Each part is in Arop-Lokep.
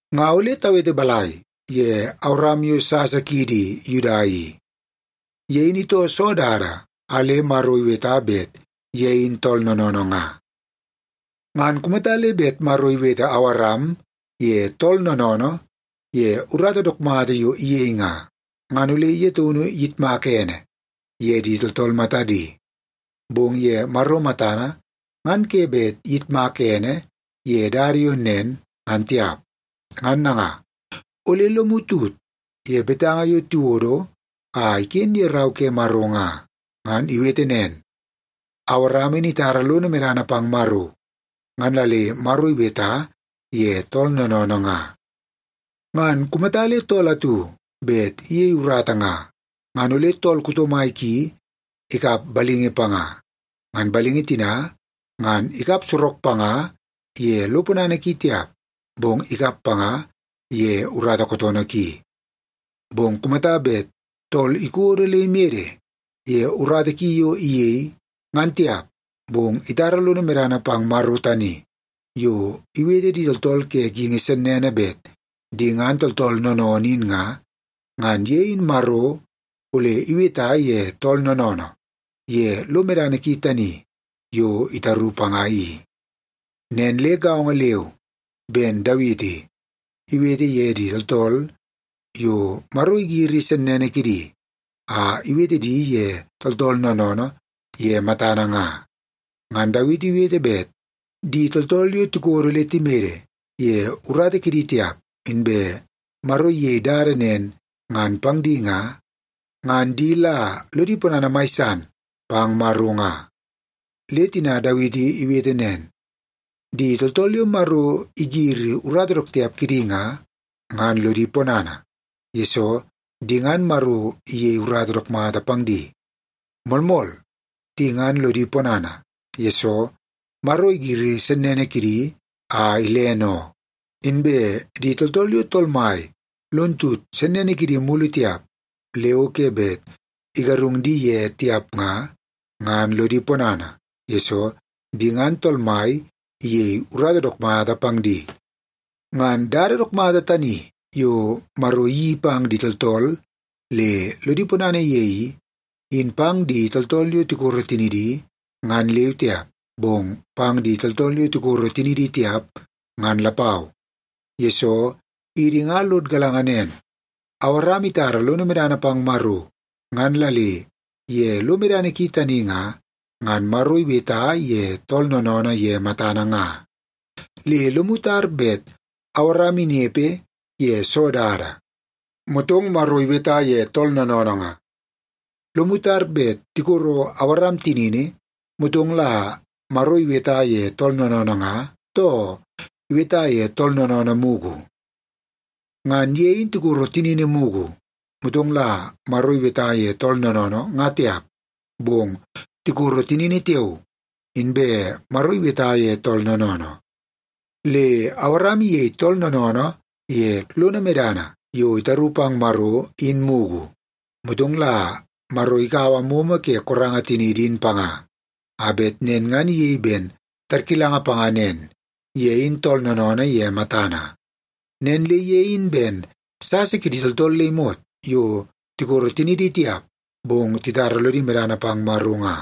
Nga ole tawete balai ye Awaram yo sasa kiidi Yuda i? Ye in itoo soo dada a le Maro iweta bet ye in tool noonoonoo nga? Ngan kumata le bet Maro iwete Awaram ye tool noonoonoo ye urata dook mata yo iyei nga, ngan ole ye taunu iyitmaka ene ye di tooltool matadi. Bong ye Maro matana, ngan ke bet iyitmak ene ye dada yo nen, ngan tiap. Ngan nanga, ole lomu tut ye betanga yo tiwodo a iken ye Rau ke Maro nga. Ngan iwete nen, “Awaram in itara lono medana pang Maro, ngan la le Maro iweta ye tool noonoonoo nga.” Ngan kumata le tool atu bet iyei urata nga, ngan ole tool kuto mai ki ikap balingi panga. Ngan balingi tina ngan ikap sorok panga ye lo ponana ki tiap, bong ikap panga ye urata kootoonoo ki. Bong kumata bet tool ikodo le imede ye urata ki yo iyei, ngan tiap, bong itara lono medana pang Maro tani yo iwete di tooltool ke geingi sennene bet di ngan tooltool noonoonoo in nga, ngan ye in Maro ole iweta ye tool noonoonoo ye lo medana ki tani yo itaru panga i. Nen le gaongo leu ben Dawiti iwete ye di tooltool yo Maro igiri sennene kidi a iwete di ye tooltool noonoonoo ye matana nga. Ngan Dawiti iwete bet di tooltool yo tikodo le timede ye urata kidi tiap, inbe Maro iyei dada nen ngan pang di nga, ngan di la lodi ponana mai san pang Maro nga. Le tina Dawiti iwete nen, “Di tooltool yo Maro igiri urata dook tiap kidi nga, ngan lodi ponana, yesoo di ngan Maro iyei urata dook mata pang di. Moolmool, di ngan lodi ponana, yesoo Maro igiri sennene kidi a ilene oo. Inbe di tooltool yo Tool Mai lon tut sennene kidi mulu tiap le o ke bet igarung di ye tiap nga, ngan lodi ponana, yesoo di ngan Tool Mai iyei urata dook mata pang di.” Ngan dada dook mata tani yo Maro iyeii pang di tooltool le lodi ponana ye i, in pang di tooltool yo tikoro tinidi, ngan leu tiap, bong pang di tooltool yo tikoro tinidi tiap, ngan lapau. Yesoo, idi nga lod galanga nen, Awaram itara lono medana pang Maro, ngan la le ye lo medana ki tani nga, ngan Maro iweta ye tool noonoonoo ye matana nga. Le lomu tar bet Awaram inepe ye soo dada, motong Maro iweta ye tool noonoonoo nga? Lomu tar bet tikoro Awaram tinini, motong la Maro iweta ye tool noonoonoo nga, too iweta ye tool noonoonoo mugu? Ngan ye in tikoro tinini mugu, motong la Maro iweta ye tool noonoonoo, nga tiap, bong tikoro tinini tiao, inbe Maro iweta ye tool noonoonoo. Le Awaram iyei tool noonoonoo ye lono medana yo itaru pang Maro, in mugu, motong la Maro ikaua momo ke koranga tiniidi in panga, a bet nen ngan iyei ben tarkilanga panga nen; ye in tool noonoonoo ye matana. Nen le ye in ben sasa kidi tooltool le imot yo tikoro tinidi tiap, bong titara lodi medana pang Maro nga.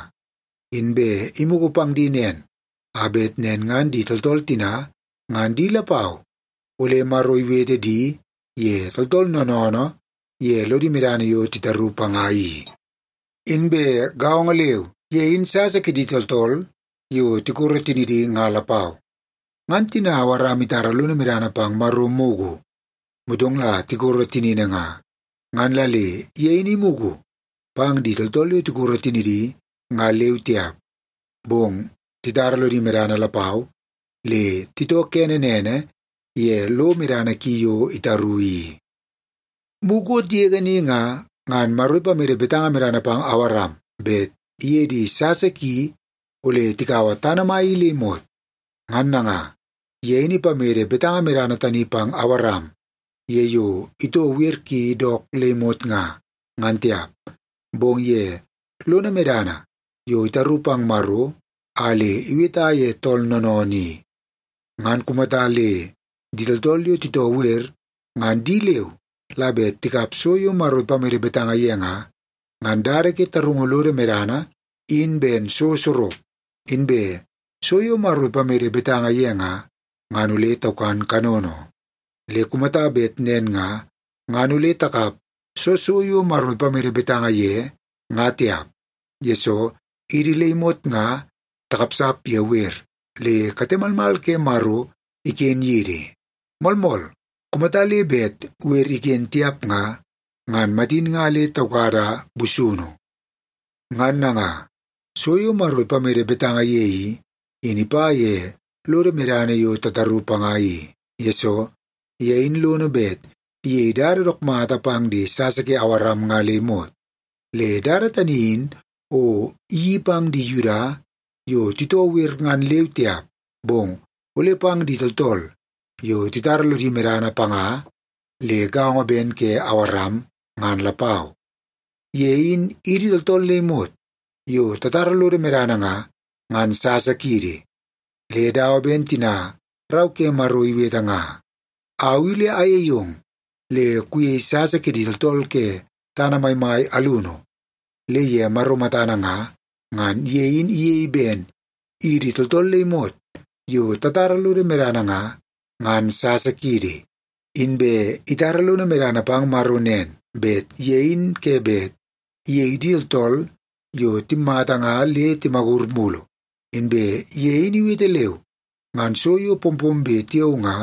Inbe imugu pang di nen, a bet nen ngan di tooltool tina ngan di lapau ole Maro iwete di ye tooltool noonoonoo ye lodi medana yo titaru panga i. Inbe gaongo leu, ye in sasa kidi tooltool yo tikoro tinidi nga lapau. Ngan tina Awaram itara lono medana pang Maro mugu, motong la tikoro tinini nga, ngan la le ye in imugu pang di tooltool yo tikoro tinidi nga leu tiap, bong titara lodi medana lapau le titoo kene nene ye lo medana ki yo itaru i. Mukot yege ni nga, ngan Maro ipamede betanga medana pang Awaram bet iye di sasa ki ole tikaua tana mai i le imot. Ngan nanga, ye in ipamede betanga medana tani pang Awaram ye yo itoo wer ki dook le imot nga, ngan tiap, bong ye lono medana yo itaru pang Maro a le iweta ye tool noonoonoo i. Ngan kumata le di tooltool yo titoo wer ngan di leu la bet tikap so yo Maro ipamede betanga ye nga, ngan dada ke tarungu lodo medana in ben so sorok, inbe so yo Maro ipamede betanga ye nga, ngan ole taukan kanono. Le kumata bet nen nga, ngan ole takap soo so yo Maro ipamede betanga ye nga tiap, yesoo idi le imot nga takapsap ye wer, le kate malmal ke Maro iken yidi. Moolmool, kumata le bet wer iken tiap nga, ngan matin nga le taukada busunu. Ngan nanga, so yo Maro ipamede betanga ye i, in ipa ye lodo medana yo tataru panga i, yesoo ye in lono bet iyei dada dook mata pang di sasa ke Awaram nga le imot. Le dada tani in o iyeii pang di Yuda yo titoo wer ngan leu tiap, bong ole pang di tooltool yo titara lodi medana panga le gaongo ben ke Awaram, ngan lapau. Ye in idi tooltool le imot yo tatara lodo medana nga, ngan sasa kiidi. Le dawa ben tina Rau ke Maro iwete nga, “Au i ole ayei ong le kuyei sasa kidi tooltool ke tana maimai alunu.” Le ye Maro matana nga, ngan ye in iyei ben idi tooltool le imot yo tatara lodo medana nga, ngan sasa kiidi. Inbe itara lono medana pang Maro nen; bet ye in ke bet iyei di tooltool yo timmata nga le timagur mulu, inbe ye in iwete leu, ngan so yo pompombe tiao nga,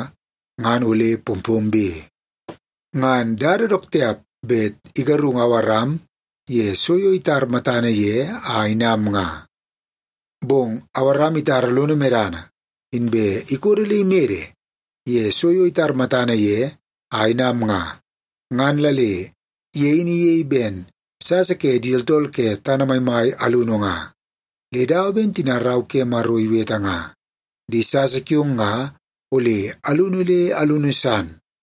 ngan ole pompombe. Ngan dada dook tiap bet igarungu Awaram ye so yo itar matana ye a inam nga. Bong Awaram itara lono medana, inbe ikodo le imede ye so yo itar matana ye a inam nga, ngan la le ye in iyei ben sasa ke di tooltool ke tana maimai alunu nga. Le dawa ben tina Rau ke Maro iwete nga, “Di sasa kiong nga ole alunu le alunu san.”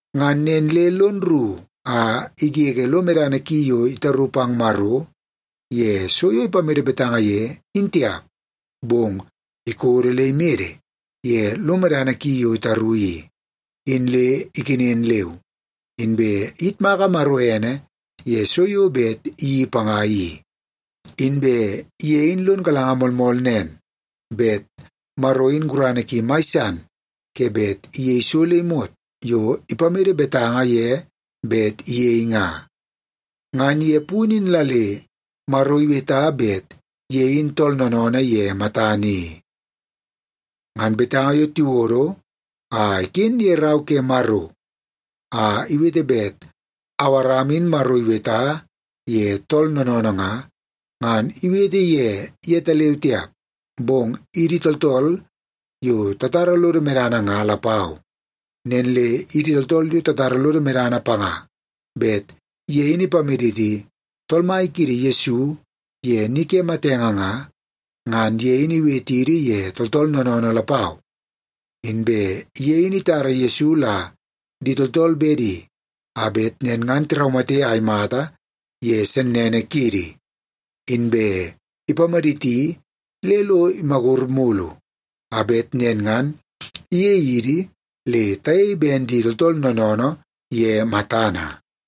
Ngan nen le lon rru a igege lo medana ki yo itaru pang Maro ye so yo ipamede betanga ye, in tiap. Bong ikodo le imede ye lo medana ki yo itaru i, in le ikenen leu, inbe iyitmaka Maro ene ye so yo bet iyeii panga i. Inbe ye in lon galanga moolmool nen, bet Maro in gurana ki mai san ke bet iyei so le imot yo ipamede betanga ye bet iyei nga. Ngan ye punu in la le Maro iweta bet ye in tool noonoonoo ye matana i. Ngan betanga yo tiwodo a iken ye Rau ke Maro a iwete bet Awaram in Maro iweta ye tool noonoonoo nga, ngan iwete ye yetaleu tiap, bong idi tooltool yo tatara lodo medana nga lapau. Nen le idi tooltool yo tatara lodo medana panga bet ye in ipamaditi Tool Mai kiidi Yesu ye ni ke matenge nga, ngan ye in iwetidi ye tooltool noonoonoo lapau. Inbe ye in itara Yesu la di tooltool bedi a bet nen ngan tiraumate a imata ye sennene kiidi. Inbe ipamaditi le lo imagur mulu, a bet nen ngan iyei idi le tayei ben di tooltool noonoonoo ye matana.